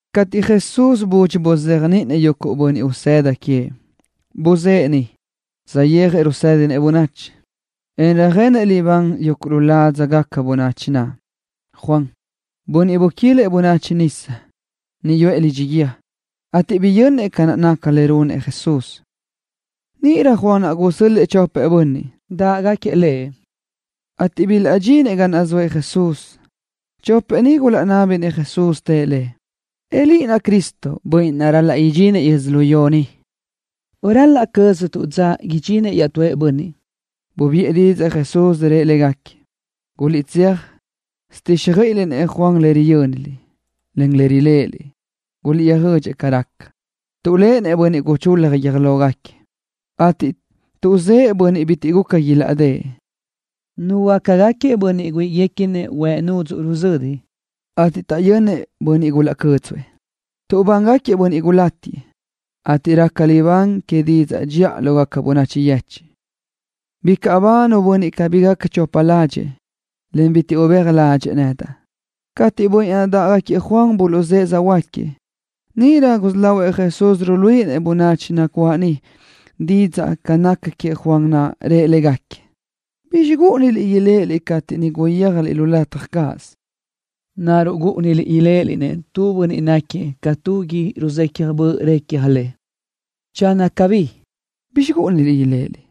Cateʼ Jesús budxi buzéajniʼinëʼ yuguʼ bönniʼ usëda queëʼ, buzë́ʼë niʼ, saʼyéajëʼ röjsédinëʼ bönachi, en röjenëʼ libán yuguʼ lu ládzagaca bönachi naʼ. Juan, bönniʼ buquilëʼ bönachi nisa, niʼ yuʼë lidxi guíë, ateʼ biyönnëʼ ca nácagaca le runëʼ Jesús. Níʼirö Juan naʼ gusö́l-lëʼë chopëʼ bönniʼ dáʼgaquiëʼ lëʼ, ateʼ bilaʼdxinëʼ ga naʼ zoëʼ Jesús. Chopëʼ ni gulaʼnábinëʼ Jesús, tëʼ Lëʼ: —¿Nacuʼ Liʼ Cristo, Bönniʼ naʼ ral-laʼ idxinëʼ yödzölió ni, o ral-laʼ cöztuʼ dza idxinëʼ iaʼtúëʼ bönniʼ? Bubiʼë didzaʼ Jesús, rëʼ légaquiëʼ: —Guliʼtséaj tsöjtíxjöiʼiliʼ-nëʼ Juan lë ni riyö́niliʼ, en riléʼeliʼ. Guliʼtsöjödxëʼ ca raca, tuʼléʼenëʼ bönniʼ guchul-la guiö́j lógaquiëʼ, ateʼ tuʼzë́ʼë bönniʼ bitiʼ guca ilaʼdë́ʼ. Nuhuöácagaquiëʼ bönniʼ güíʼiguequinëʼ huëʼ nudzuʼ ruzödi, ateʼ taʼyönnëʼ bönniʼ gulaʼcö́dzuëʼ. Nnitaʼ nabángaquiëʼ bönniʼ gulátiëʼ, ateʼ raca libán que didzaʼ dxiʼa lógaca bönachi yechiʼ. Bicaʼ ba nu bönniʼ bitiʼ gáquiëʼ chopa ládxëʼë, bitiʼ ubéaj ládxëʼë nedaʼ. Cateʼ yuguʼ bönniʼ naʼ dáʼgaquiëʼ Juan buluʼzë́ʼë söjhuö́jgaquiëʼ, níʼirö gusí lahuëʼ Jesús ruíʼilenëʼ bönachi nacuáʼ niʼ didzaʼ ca naca queëʼ Juan naʼ. Rëʼ légaquiëʼ: —¿Bizxi gúʼuniliʼ iléʼeliʼ cateʼ niʼ guyéajliʼ lu lataj cáʼasö? ¿Naruʼ gúʼuniliʼ iléʼeliʼ-nëʼ tu bönniʼ náquiëʼ ca tu gui ruzecaj böʼ recja le? Channö cabí, ¿bizxi gúʼuniliʼ iléʼeliʼ?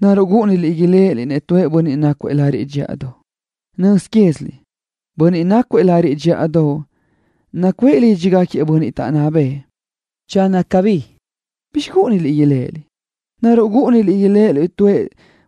¿Naruʼ gúʼuniliʼ iléʼeliʼ-nëʼ tu bönniʼ nácuëʼ lariʼ dxíʼadoʼ? Nöz quéziliʼ bönniʼ nácugaquiëʼ lariʼ dxíʼadoʼ nacuʼë lídxigaquiëʼ bönniʼ taʼnná bëʼë. Channö cabí, ¿bizxi gúʼuniliʼ iléʼeliʼ? ¿Naruʼ gúʼuniliʼ iléʼeliʼ-nëʼ tu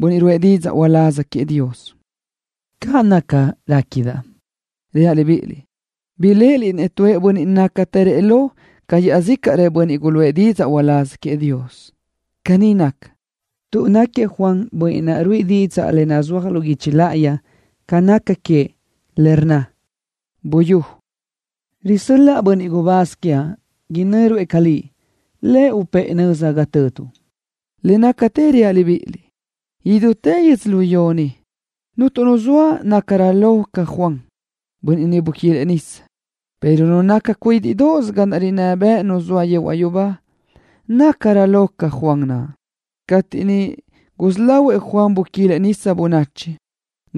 bönniʼ ruʼë didzaʼ uláz queëʼ Dios? Caʼ naca, réquidaʼ. Reaʼ libíʼiliʼ, biléʼeliʼ-nëʼ tu bönniʼ nácatërëʼ lo ca iaʼzícaʼrëʼ bönniʼ guluʼë didzaʼ uláz queëʼ Dios. Caní naca, tuʼ náquiëʼ Juan bönniʼ naʼ ruíʼi didzaʼ le nazúaj lu guichi láʼayi ca naca queëʼ, le rnna: Buyú, risö́l-laʼa bönniʼ gubáz quiaʼ, inö́ruëʼ ca Liʼ. Lëʼ upë́ʼë nöza ga töduʼ. Le nácatë reaʼ libíʼiliʼ. Idútë yödzölió ni, cuntu nu zoa nácarö lo ca Juan, bönniʼ niʼ buquilëʼ bönachi nisa, pero nu naca cuídiʼdoʼos ga rinná bëʼ Nu naʼ zoa yehuaʼ yubá nácatërö lo ca Juan naʼ. ’Cateʼ niʼ gusí lahuëʼ buquilëʼ Juan bönachi nisa,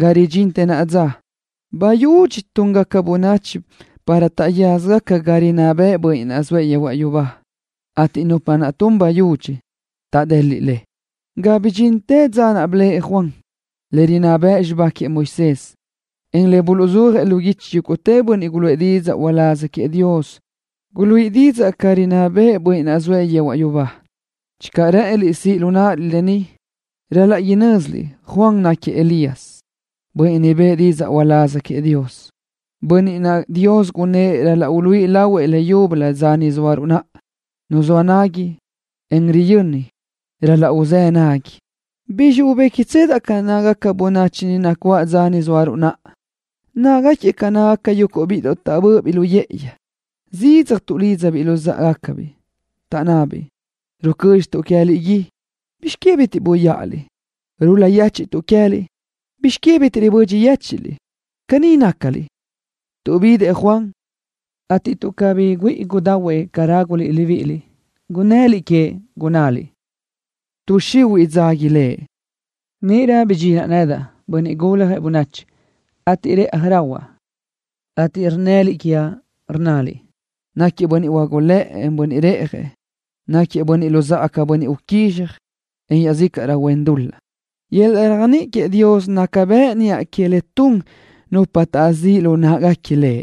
ga ridxintë naʼa dza, bayudxi túngaca bönachi para taʼyaza ga rinná bëʼë Bönniʼ naʼ zoëʼ yehuaʼ yubá, ateʼ nupa tunsö bayudxi taʼdeliʼ le. Ga bidxintë dza naʼ blëʼë Juan, le rinná bëʼ xibá queëʼ Moisés, en le buluʼzúajëʼ lu guichi yúguʼtë bönniʼ guluʼë didzaʼ uláz queëʼ Dios guluíʼi didzaʼ ca rinná bëʼë Bönniʼ naʼ zoëʼ yehuaʼ yubá. Channö rë́ʼëniliʼ siʼ lu náʼaliʼ lë ni, ral-laʼ inö́ziliʼ Juan naʼ náquiëʼ Elías, bönniʼ niʼ bëʼë didzaʼ uláz queëʼ Dios, bönniʼ naʼ Dios gunnë́ʼ ral-laʼ iláʼ lahuëʼ leyúbölö dza ni zóaruʼ naʼa. Nu zoa nagui, en riyöni ral-laʼ uzë́ nagui. ’¿Bizxi ubéquiʼtsedaʼ ca nácagaca bönachi nacuáʼ dza ni zóaruʼ naʼa? Nácagaquiëʼ ca yuguʼ bíʼidoʼ taʼbö́ʼöbiʼ lu yë́ʼëyi. Zidzaj tuʼlídzabiʼ luzáʼagacabiʼ, taʼnnabiʼ: “Rucö́dxituʼ queë́liʼ gui. ¿Bizx que bitiʼ ruyáʼaliʼ? Rul-la yéchiʼtuʼ queë́liʼ. ¿Bizx que bitiʼ ribödxi yéchiʼliʼ?” Caní nácaliʼ, tuʼ bidëʼ Juan, ateʼ tuʼ cabí güíʼi gudahuëʼ ca ráguliʼ libíʼiliʼ, gunnëliʼ queëʼ, gunnaliʼ: “Tuʼ xihuiʼ dzágui lëʼ.” Níʼirö bidxinaʼ nedaʼ, Bönniʼ Guljëʼ Bönachi, ateʼ reʼaj rahuaʼ, ateʼ rnnëliʼ quiaʼ, rnnaliʼ: “Náquiëʼ bönniʼ huágulëʼë, en bönniʼ reʼjëʼ. Náquiëʼ luzáʼagaquiëʼ bönniʼ uquízxaj, en iaʼzícaʼrö huen dul-laʼ.” Yöl-laʼ réajniʼi queëʼ Dios naca bëʼ niʼa que le tun nupa taʼzíʼ lu në́ʼeguequi le.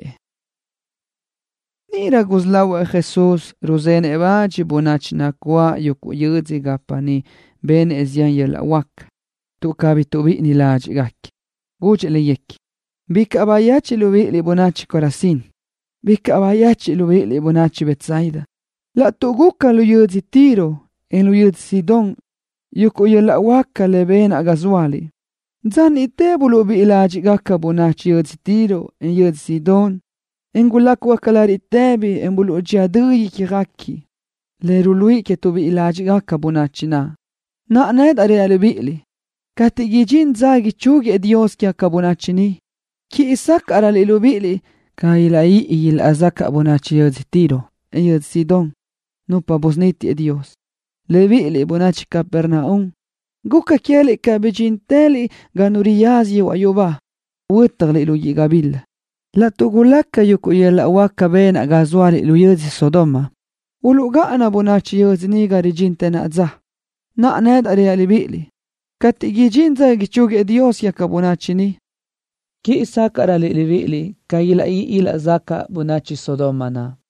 Níʼirö gusí lahuëʼ Jesús ruzenëʼ bach bönachi nacuáʼ yuguʼ yödzö gapa niʼ benëʼ zián yöl-laʼ huáca, tuʼ cabí tuʼbíʼini ládxiʼguequi. Gudxëʼ léguequi: —Bicaʼ bayechiʼ libíʼiliʼ, bönachi Corazín. Bicaʼ bayechiʼ libíʼiliʼ, bönachi Betsaida. Laʼtuʼ gulaca lu yödzö Tiro, en lu yödzö Sidón yuguʼ yöl-laʼ huáca benaʼ ga zóaliʼ, dza níʼtëlö uluʼbíʼi ládxiʼgaca bönachi yödzö Tiro, en yödzö Sidón naʼ, en ilácugaca lariʼ tëbi, en uluʼdxía dö ícjaguequi, le uluʼluíʼi tuʼbíʼi ládxiʼgaca bönachi naʼ. Naʼa, nedaʼ reaʼ libíʼiliʼ, cateʼ idxín dza ichúguiëʼ Dios quégaca bönachi, quíʼi sácaʼröliʼ libíʼiliʼ ca ilaʼguíʼi ilaʼzacaʼ bönachi yödzö Tiro, en yödzö Sidón, nupa naʼ busunítiëʼ Dios. Libíʼiliʼ, bönachi Capernaum, guca queë́liʼ ca bidxíntëliʼ ga nu riyaza yehuaʼ yubá. Huö́tjaliʼ lu guíʼ gabila. Laʼtuʼ gulaca yuguʼ yöl-laʼ huáca benaʼ ga zóaliʼ lu yödzö Sodoma, uluʼgáʼana bönachi yödzö niʼ ga ridxintë naʼa dza. Naʼa, nedaʼ reaʼ libíʼiliʼ, cateʼ idxín dza ichúguiëʼ Dios quégaca bönachi, quíʼi sácaʼröliʼ libíʼiliʼ ca ilaʼguíʼi ilaʼzacaʼ bönachi Sodoma naʼ.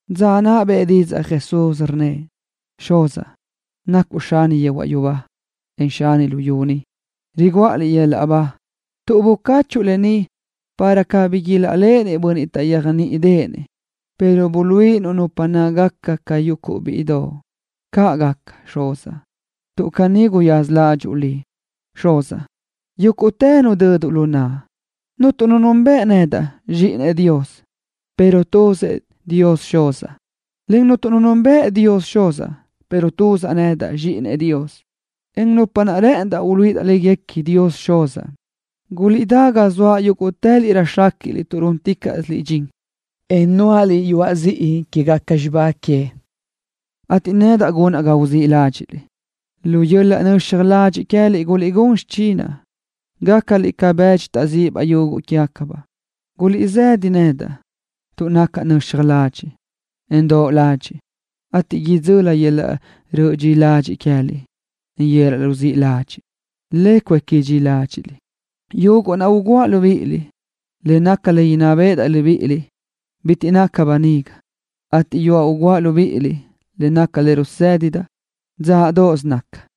Dza naʼ bëʼë didzaʼ Jesús, rnnëʼ: —Xuzaʼ, nacuʼ Xani yehuaʼ yubá, en Xani luyú ni. Riguʼa Liʼ yöl-laʼ ba, tuʼ bucáchuʼu lë ni, para cabí ilaʼléʼenëʼ bönniʼ taʼyéajniʼideʼenëʼ le, pero buluíʼinuʼ nupa nácagaca ca yuguʼ bíʼidoʼ le. Caʼ gaca, Xuzaʼ, tuʼ caní guyaza ládxuʼu Liʼ. Yúguʼtë nudödëʼ Xuzaʼ lu naʼa. Cuntu nu nunbëʼ nedaʼ, Zxíʼinëʼ Dios, pero tuzëʼ Dios Xuz, en cuntu nu nunbëʼ Dios Xuz, pero tuzaʼ nedaʼ, Zxíʼinëʼ Dios, encaʼ nupa naʼ rë́ʼëndaʼ uluíʼidaʼ léguequi Dios Xuz. Guliʼdá ga zoaʼ yúguʼtëliʼ röjxéquiʼliʼ tuʼ rúnticaʼsiliʼ dxin que yöl-laʼ yudoʼ, en nuáʼaliʼ yuaʼ ziʼi quégaca xibá que, ateʼ nedaʼ gunaʼ ga uzíʼ ládxiʼliʼ. Lu yöl-laʼ nöxaj ladxiʼ queë́liʼ guliʼgún xichinaʼ, gácaliʼ ca bëdxi taʼzíʼibaʼ yuguʼ quégacabaʼ. Guliʼsëda lu naʼa nedaʼ, tuʼ nacaʼ nöxaj ladxiʼ, en doʼ ladxiʼ, ateʼ idzöli yöl-laʼ ruzíʼ ladxiʼ queë́liʼ, le cuéqui dxi ládxiʼliʼ. Yuguʼ naʼ uguʼa libíʼiliʼ, le naca le inná béʼedaʼ libíʼiliʼ, bitiʼ naca böniga, ateʼ yuaʼ uguʼa libíʼiliʼ le naca le rusédidaʼ, dzáʼdoʼos naca.